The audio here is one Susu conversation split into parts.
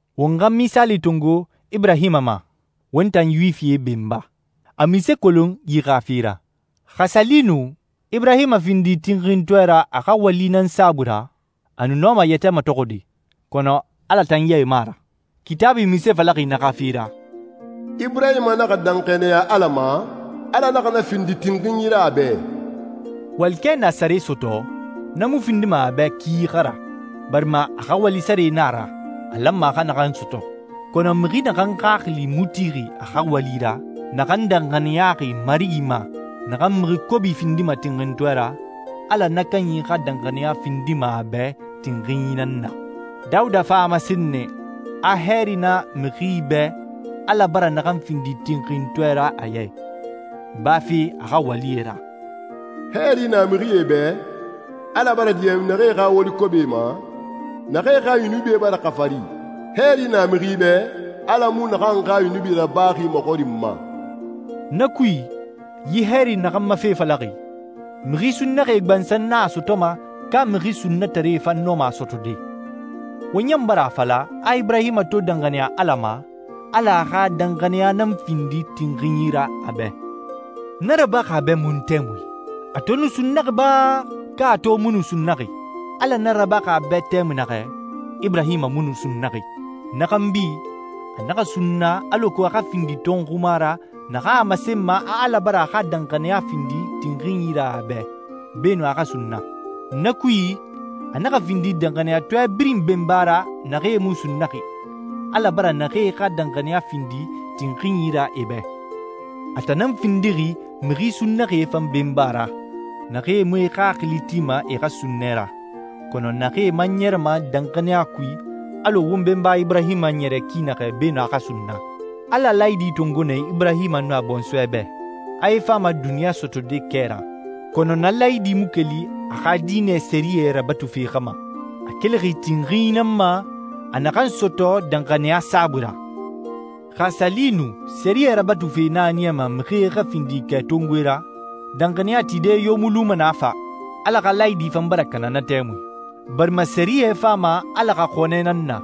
Won xa misaali tongo Iburahima ma, won tan Yuwifie benba. A munse kolon yi xa fe ra? Xa a sa li nu Iburahima findi tinxintɔɛ ra a xa wali nan saabui ra, a nu nɔma a yɛtɛ matɔxɔde, kɔnɔ Ala tan ya i mu a ra. Kitaabui munse falaxi na xa fe ra? «Iburahima naxa danxaniya Ala ma, Ala naxa na findi tinxinyi ra a bɛ.» Walikɛ na a sare sɔtɔ, na mu findima a bɛ ki xa ra, barima a xa wali sare na a ra a lanma a xa naxan sɔtɔ. Kɔnɔ mixi naxan xaxili mu tixi a xa wali ra, naxan danxaniyaxi Marigi ma naxan mixi kobi findima tinxintɔɛ ra, Ala na kanyi xa danxaniya findima a bɛ tinxinyi nan na. Dawuda fan a masen nɛ a hɛɛri na mixi bɛ Ala bara naxan findi tinxintɔɛ ra a ya i, bafe a xa walie ra: «Hɛɛri na mixie bɛ, Ala bara diɲɛ naxee xa wali kobie ma, naxee xa yunubie bara xafari. Hɛɛri na mixi bɛ, Ala mu naxan xa yunubi rabaxi maxɔrinma.» Na kui, yi hɛɛri naxan ma fe falaxi, mixi sunnaxie gbansan nan a sɔtɔma, ka mixi sunnataree fan nɔma a sɔtɔde? Won ɲan bara a fala a Iburahima to danxaniya Ala ma, Ala a xa danxaniya nan findi tinxinyi ra a bɛ. Na rabaxi a bɛ mun tɛmui? A to nu sunnaxi ba, ka a to mu nu sunnaxi? Ala na rabaxi a bɛ tɛmui naxɛ, Iburahima mu nu sunnaxi. Na xanbi, a naxa sunna alako a xa findi tɔnxuma ra naxan a masenma a Ala bara a xa danxaniya findi tinxinyi ra a bɛ beenun a xa sunna. Na kui, a naxa findi danxaniyatɔɛ birin benba ra naxee mu sunnaxi, Ala bara naxee xa danxaniya findi tinxinyi ra e bɛ. A tan nan findixi mixi sunnaxie fan benba ra naxee mu e xaxili tima e xa sunnɛ ra, kɔnɔ naxee man ɲɛrɛma danxaniya kui alɔ won benba Iburahima ɲɛrɛ ki naxɛ beenun a xa sunna. Ala laayidi tongo nɛ Iburahima nun a bɔnsɔɛ bɛ, a e fama duniɲa sɔtɔde kɛ ra. Kɔnɔ na laayidi mu keli a xa diinɛ sɛriyɛ rabatufe xa ma. A kelixi tinxinyi nan ma a naxan sɔtɔ danxaniya saabui ra. Xa a sa li nu sɛriyɛ rabatufe nan a niyama mixie xa findi kɛtongoe ra, danxaniya tide yo mu luma na fa, Ala xa laayidi fan bara kana na tɛmui. Barima sɛriyɛ fama Ala xa xɔnɛ nan na,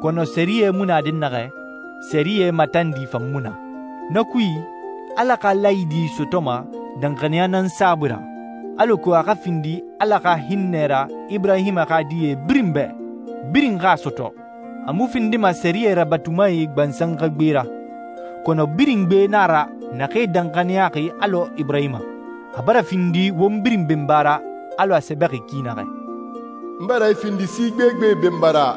kɔnɔ sɛriyɛ mu na dɛnnaxɛ, sɛriyɛ matandi fan mu na. Na kui, Ala xa laayidi sɔtɔma danxaniya nan saabui ra, alako a xa findi Ala xa hinnɛ ra Iburahima xa die birin bɛ, birin xa a sɔtɔ. A mu findima sɛriyɛ rabatumae gbansan xa gbe ra, kɔnɔ birin gbe na a ra naxee danxaniyaxi alɔ Iburahima. A bara findi won birin benba ra alɔ a sɛbɛxi ki naxɛ, «N bara i findi si gbegbe benba ra.»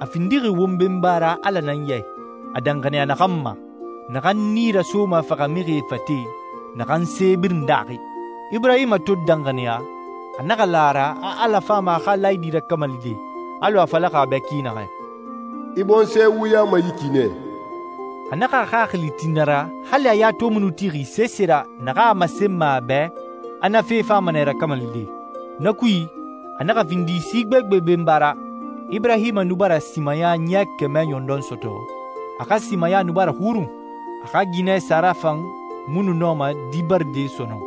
A findixi won benba ra Ala nan ya i, a danxaniya naxan ma, naxan nii rasoma faxamixie fate, naxan se birin daaxi. Iburahima to danxaniya, a naxa la a ra a Ala fama a xa laayidi rakamalide alɔ a falaxi a bɛ ki naxɛ, «I bɔnsɔɛ wuyama yi ki nɛ.» A naxa a xaxili ti na ra hali a ya to mu nu tixi sese ra naxan a masenma a bɛ a na fe fama nɛ rakamalide. Na kui, a naxa findi si gbegbe benba ra. Iburahima nu bara simaya ɲɛ kɛmɛ ɲɔndɔn sɔtɔ, a xa simaya nu bara xurun, a xa ginɛ Sara fan mu nu nɔma di baride sɔnɔn.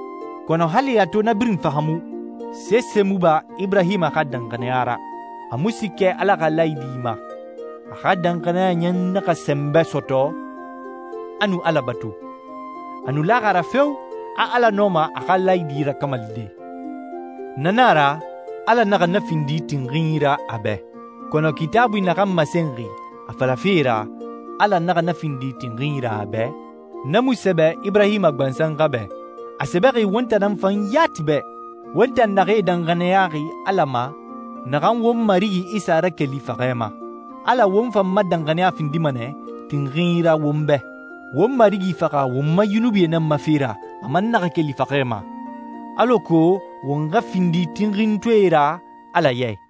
Kɔnɔ hali a to na birin fahaamu, sese mu ba Iburahima xa danxaniya ra. A mu siikɛ Ala xa laayidi ma, a xa danxaniya ɲan naxa sɛnbɛ sɔtɔ, a nu Ala batu. A nu laxi a ra feo, a Ala nɔma a xa laayidi rakamalide. Na na a ra «Ala naxa na findi tinxinyi ra a bɛ.» Kɔnɔ Kitaabui naxan masenxi a falafe ra, «Ala naxa na findi tinxinyi ra a bɛ,» na mu sɛbɛ Iburahima gbansan xa bɛ. A sɛbɛxi won tan nan fan yati bɛ, won tan naxee danxaniyaxi Ala ma naxan won Marigi Isa rakeli faxɛ ma. Ala won fan ma danxaniya findima nɛ tinxinyi ra won bɛ. Won Marigi faxa won ma yunubie nan ma fe ra, a man naxa keli faxɛ ma, alako won xa findi tinxintɔɛe ra Ala ya i.